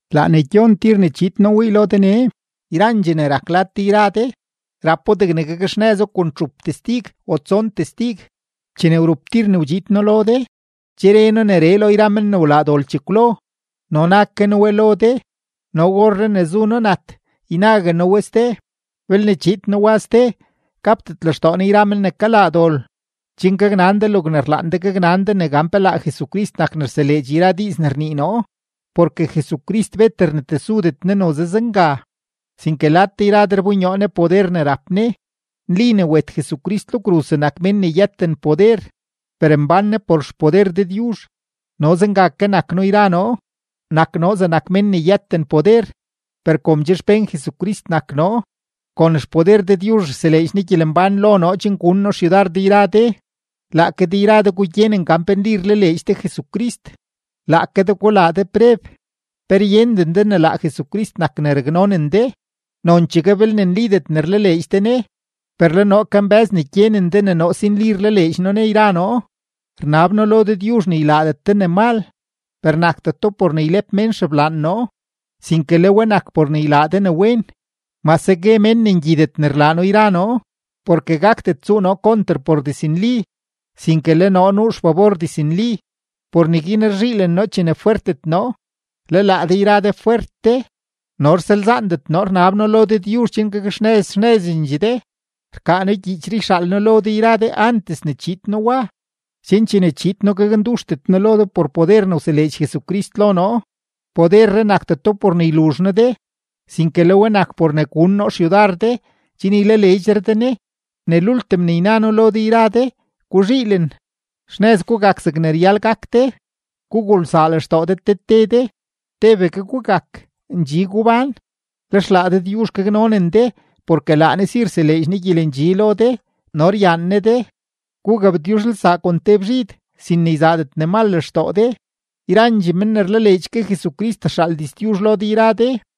Laa ne gyon tir ne chiid noo wii lo de nee. Yrandxee ne rak lad de yra de, rapo degne gakxnëzo kon txup testig o tson testig. Chene wrup tir ne wdxiid noo lo de, che re noo neree lo yra men ne wlaa dol chekwlo no na ke noo we lo de no orree ne zu noo nat ynague noo we ste: belne chiid noo wa ste, gapdet lextoo noo yra men ne kalaa dol, chen gaknan de logne rlaan de gaknan de ne gan pe laa Jesucrist nak ne rseleedx yra diiz ne rnii noo. Porke Jesucrist bet rnetesudet Ne noze zenga, sinke lad de yra de rbonyoo Ne poder ne rap Ne. Nli ne wet Jesucrist lo kruz zegnak mén ne yëten poder, per mbán Ne por xpoder Dëdyuzh; no zenga ke nak noo yra noo, nak noo zegnak mén ne yëten poder, per kom che xpén Jesucrist nak noo, kon xpoder Dëdyuzh rseleedx Ne gyelembán lo noo chen gun noo xyudar de yra de. Laake de yra de gugyenen gan pe nli rlaleedx de Jesucrist; laake de gulaa de preb. ¿Pe ryenden de ne laa Jesucrist nak ne raknonen de, nonchegue belne nlidet ne rlaleedx de Ne? Per le noo kambë́z ne gyenen de ne noo si nli rlaleedx noo Ne yra noo. Rnab noo lo Dëdyuzh ne ylaadet de ne mal, per nakdeto por ne ylep mén xeblaan noo, sinke le we nak por ne ylaa de ne wen, mase gue mén ne ngyidet ne rlaa noo yra noo. Porke gakdet tsuu noo konter por diznli, sinke le noo nuu xfabor diznli. Por neguin rzhiilen noo chene fwertet noo, le laa de yra de fwert de. No rsalzaandet noo rnab noo lo Dëdyuzh chen gakxnëz xnëzendxee de. Rkaa noo gyiichree yxaal noo lo de yra de antes ne chiid noo wa, chen chene chiid noo gaknduxdet noo lo de por poder ne wseleedx Jesucrist lo noo; poderree nakdeto por ne yluzh noo de, sinke le we nak por ne gun noo xyudar de chen ylaleedxre de Ne. Ne lultim ne yna noo lo de yra de, guzhiilen, xnëz gugak zegne ryal gak de, gugulsaa lextoo de te te de, tebegue gugak, ndxi gubán. Lex laa Dëdyuzh gaknonen de porke laa Ne si rseleedx Ne gyelendxi lo de no ryaan Ne de. Gugabtyuzhelsaa kon te bzhid, sin ne yzaadet ne mal lextoo de. Yrandxee men ne rlaleedx ke Jesucrist rxaal diztyuzh lo de yra de.